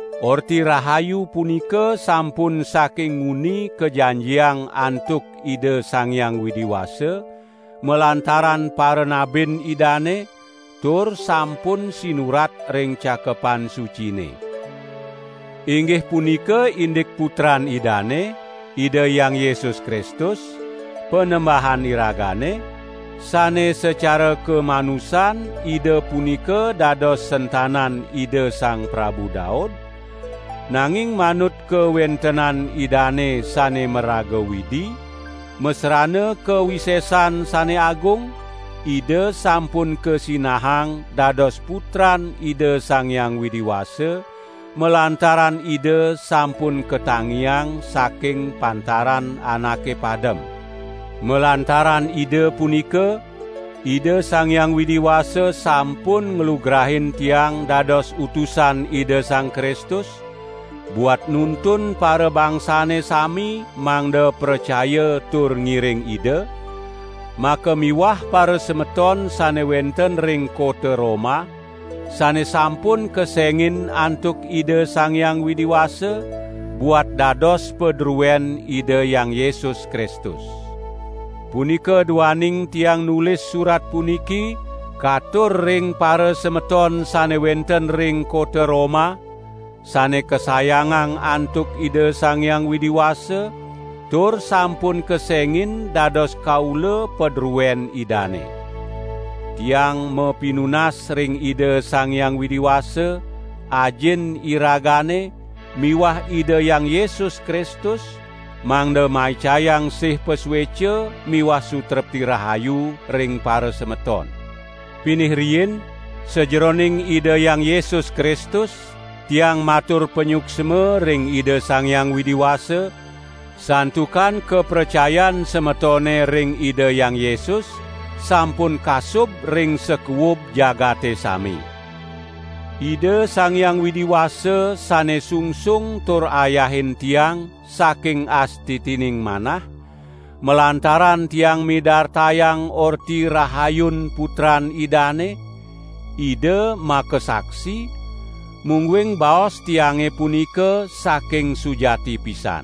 Orti Rahayu punika sampun saking nguni kajanjiang antuk Ida Sang Hyang Widi Wasa, malantaran paranabin Idane, tur sampun sinurat ring Cakepan Sucine. Inggih punika indik Putran Idane, Ida Hyang Yesus Kristus, Panembahan iragane; sane sacara kamanusan Ida punika dados sentanan Ida Sang Prabu Daud, nanging manut kawentenan Idane sane maraga Widi, masrana kawisesan sane agung, Ida sampun kasinahang dados Putran Ida Sang Hyang Widi Wasa, malantaran Ida sampun katangiang saking pantaran anake padem. Malantaran Ida punika, Ida Sang Hyang Widi Wasa sampun nglugrain tiang dados utusan Ida Sang Kristus, buat nuntun parabangsane sami mangda pracaya tur ngiring Ida, makamiwah parasemeton sane wenten ring kota Roma, sane sampun kesengin antuk Ida Sang Hyang Widi Wasa, buat dados padruen Ida Hyang Yesus Kristus. Punika duaning tiang nulis surat puniki katur ring parasemeton sane wenten ring kota Roma, sane kasayangang antuk Ida Sang Hyang Widi Wasa, tur sampun kesengin dados kaula padruen Idane. Tiang mapinunas ring Ida Sang Hyang Widi Wasa, Ajin iragane miwah Ida Hyang Yesus Kristus mangda maicayang sih pasueca miwah sutrepti rahayu ring parasemeton. Pinih riin, sajeroning Ida Hyang Yesus Kristus tiang matur panyuksma ring Ida Sang Hyang Widi Wasa, santukan kapracayan semetone ring Ida Hyang Yesus sampun kasub ring sakuub jagate sami. Ida Sang Hyang Widi Wasa sane sungsung tur ayahin tiang saking astitining manah, malantaran tiang midartayang Orti Rahayun Putran Idane, Ida makasaksi, mungguing baos tiange punika saking sujati pisan.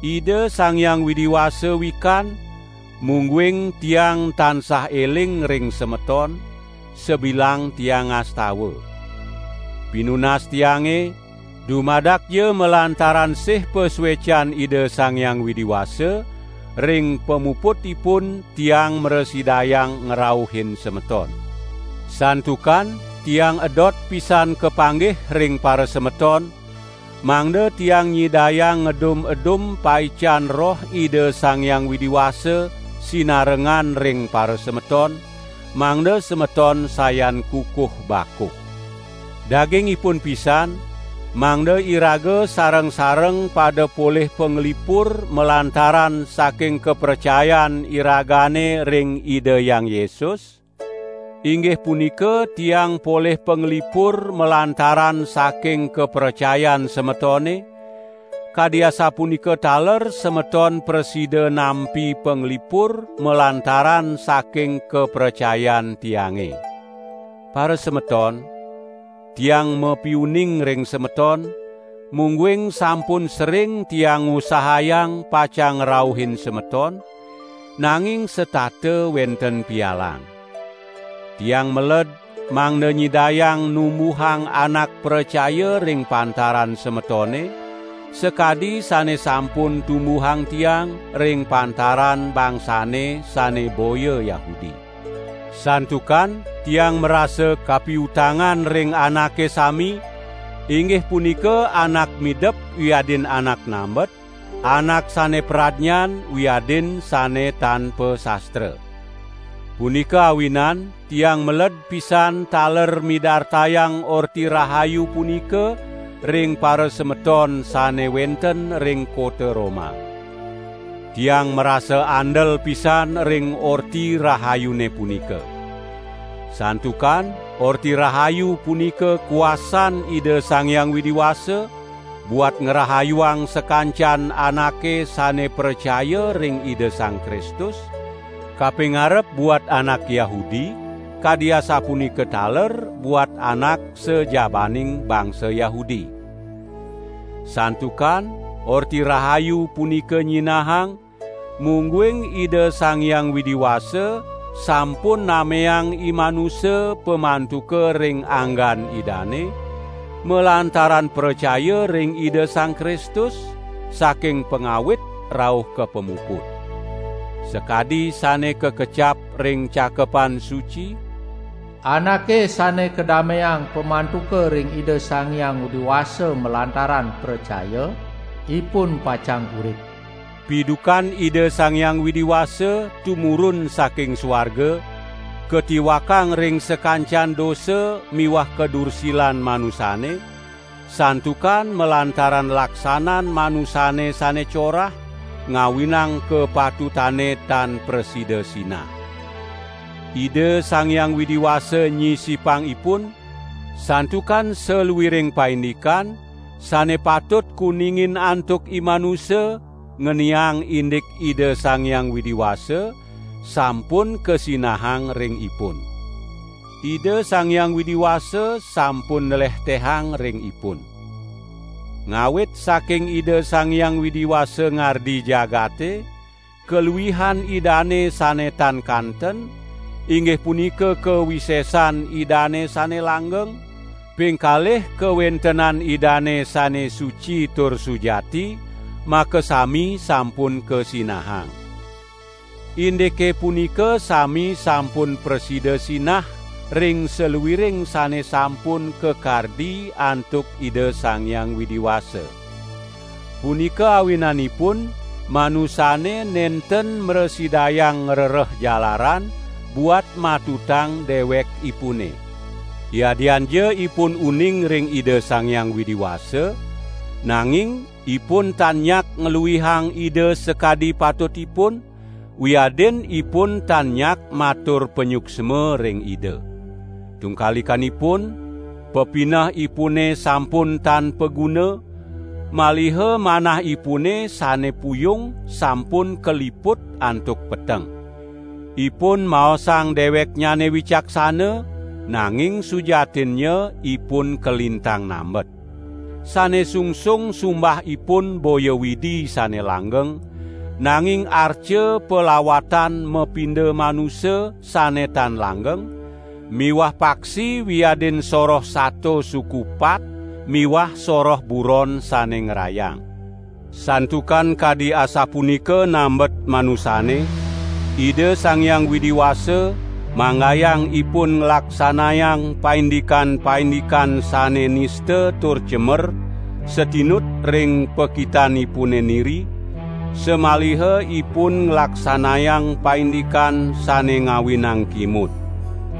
Ida Sang Hyang Widi Wasa wikan, mungguing tiang tansah eling ring semeton, sabilang tiang ngastawa. Pinunas tiange, dumadakja malantaran sih pasuecan Ida Sang Hyang Widi Wasa, ring pamuputipun tiang mrasidayang ngrauhin semeton. Santukan tiang edot pisan kapanggih ring parasemeton, mangda tiang nyidayang ngedum-edum paican Roh Ida Sang Hyang Widi Wasa sinarengan ring parasemeton, mangda semeton sayan kukuh bakuh. Daging ipun pisan, mangda iraga sareng-sareng pada polih panglipur malantaran saking kapracayan iragane ring Ida Hyang Yesus, inggih punika tiang polih panglipur malantaran saking kapracayan semetone, kadi asapunika taler semeton prasida nampi panglipur malantaran saking kapracayan tiange. Parasemeton, tiang mapiuning ring semeton, mungguing sampun sering tiang ngusahayang pacang ngrauhin semeton, nanging setata wenten pialang. Tiang meled mangda nyidayang numbuhang anak pracaya ring pantaran semetone, sakadi sane sampun tumbuhang tiang ring pantaran bangsane sane boya Yahudi. Santukan tiang marasa kapiutangan ring anake sami, inggih punika anak midep wiadin anak nambet, anak sane pradnyan wiadin sane tan pasastra. Punika awinan tiang meled pisan taler midartayang Orti Rahayu punika ring parasemeton sane wenten ring kota Roma. Tiang marasa andel pisan ring Orti Rahayune punika. Santukan Orti Rahayu punika kuasan Ida Sang Hyang Widi Wasa, buat ngrahayuang sakancan anake sane pracaya ring Ida Sang Kristus, kapingarep buat anak Yahudi, kadi asapunika taler buat anak sajabaning bangsa Yahudi. Santukan Orti Rahayu punika nyinahang, mungguing Ida Sang Hyang Widi Wasa sampun nameang imanusa pamantuka ring anggan Idane, malantaran pracaya ring Ida Sang Kristus, saking pangawit rauh ka pamuput. Sakadi sane kakecap ring Cakepan Suci: "Anake sane kadameang pamantuka ring Ida Sang Hyang Widi Wasa malantaran pracaya ring Ida Sang Kristus, ipun pacang urip." Pidukan Ida Sang Hyang Widi Wasa tumurun saking suarga, katiwakang ring sakancan dosa miwah kadursilan manusane, santukan malantaran laksanan manusane sane corah, ngawinang kapatutane tan prasida sinah. Ida Sang Hyang Widi Wasa nyisipang ipun, santukan saluiring paindikan sane patut kuningin antuk imanusa ngeniang indik Ida Sang Hyang Widi Wasa, sampun kasinahang ring ipun. Ida Sang Hyang Widi Wasa sampun nlehtehang ring ipun. Ngawit saking Ida Sang Hyang Widi Wasa ngardi jagate, kaluihan Idane sane tan kanten, inggih punika kawisesan Idane sane langgeng, pingkalih kawentenan Idane sane suci tur sujati, makasami sampun kasinahang. Indike punika sami sampun prasida sinah ring saluiring sane sampun kakardi antuk Ida Sang Hyang Widi Wasa. Punika awinanipun manusane nenten mrasidayang ngrereh jalaran buat matutang dewekipune. Yadianja ipun uning ring Ida Sang Hyang Widi Wasa, nanging ipun tan nyak ngluihang Ida sakadi patutipun, wiadin ipun tan nyak matur panyuksma ring Ida. Tungkalikanipun, pepinehipune sampun tan paguna, maliha manahipune sane puyung sampun kaliput antuk peteng. Ipun maosang deweknyane wicaksana, nanging sujatinnya ipun kalintang nambet. Sane sungsung sumbah ipun boya Widi sane langgeng, nanging arca palawatan mapinda manusa sane tan langgeng, miwah paksi wiadin soroh sato suku pat miwah soroh buron sane ngrayang. Santukan kadi asapunika nambet manusane, Ida Sang Hyang Widi Wasa manggayang ipun nglaksanayang paindikan-paindikan sane nista tur cemer satinut ring pakitanipune niri, samaliha ipun nglaksanayang paindikan sane ngawinang kimud.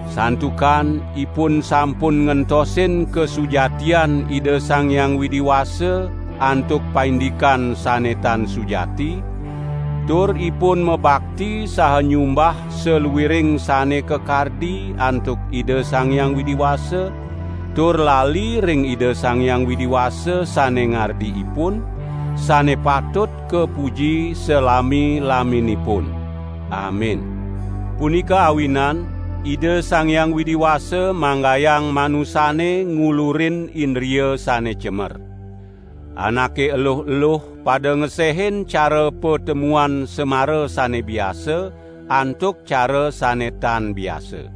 Santukan ipun sampun ngentosin kasujatian Ida Sang Hyang Widi Wasa antuk paindikan sane tan sujati; tur ipun mabakti saha nyumbah saluiring sane kakardi antuk Ida Sang Hyang Widi Wasa, tur lali ring Ida Sang Hyang Widi Wasa sane ngardi ipun, sane patut kapuji salami-laminipun. Amin. Punika awinan Ida Sang Hyang Widi Wasa manggayang manusane ngulurin indria sane cemer. Anake eluh-eluh pada ngesehin cara patemuan semara sane biasa, antuk cara sane tan biasa.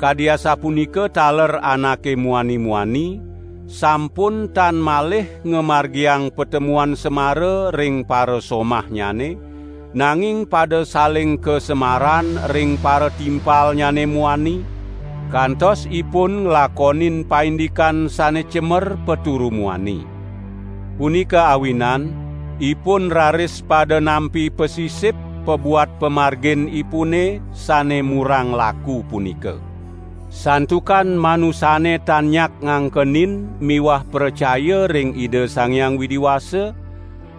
Kadi asapunika taler anake muani-muani, sampun tan malih ngamargiang patemuan semara ring parasomahnyane, nanging pada saling kasemaran ring paratimpalnyane muani, kantos ipun nglakonin paindikan sane cemer paturu muani. Punika awinan, ipun raris pada nampi pasisip pabuat pamarginipune sane murang laku punika. Santukan manusane tan nyak ngangkenin miwah pracaya ring Ida Sang Hyang Widi Wasa,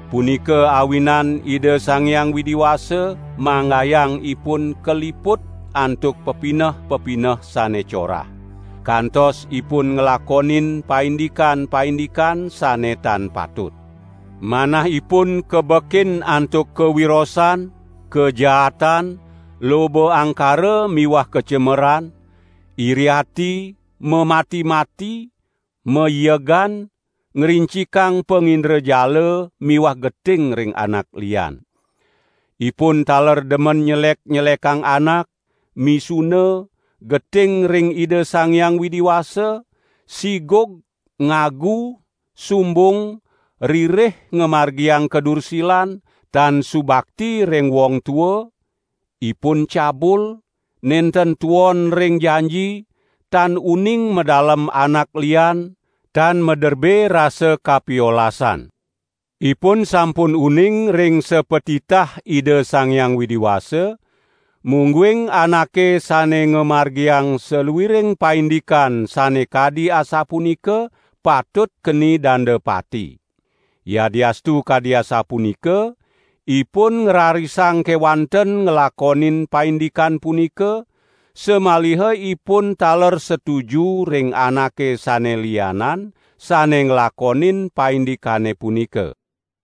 punika awinan Ida Sang Hyang Widi Wasa manggayang ipun kaliput antuk pepineh-pepineh sane corah. Kantos ipun nglakonin paindikan-paindikan sane tan patut. Manahipun kabekin antuk kawirosan, kajaatan, loba angkara miwah kacemeran, iri ati, mamati-mati, maiegan, ngrincikang pangindrajala miwah geting ring anak lian. Ipun taler demen nyelek-nyelekang anak, misuna, geting ring Ida Sang Hyang Widi Wasa, sigug, ngagu, sumbung, ririh ngamargiang kadursilan, tan subakti ring wong tua, ipun cabul, nenten tuon ring janji, tan uning madalem anak lian, tan maderbe rasa kapiolasan. Ipun sampun uning ring sapatitah Ida Sang Hyang Widi Wasa, mungguing anake sane ngamargiang saluiring paindikan sane kadi asapunika patut keni danda pati. Yadiastu kadi asapunika, ipun ngrarisang kewanten nglakonin paindikan punika, samaliha ipun taler setuju ring anake sane lianan, sane nglakonin paindikane punika.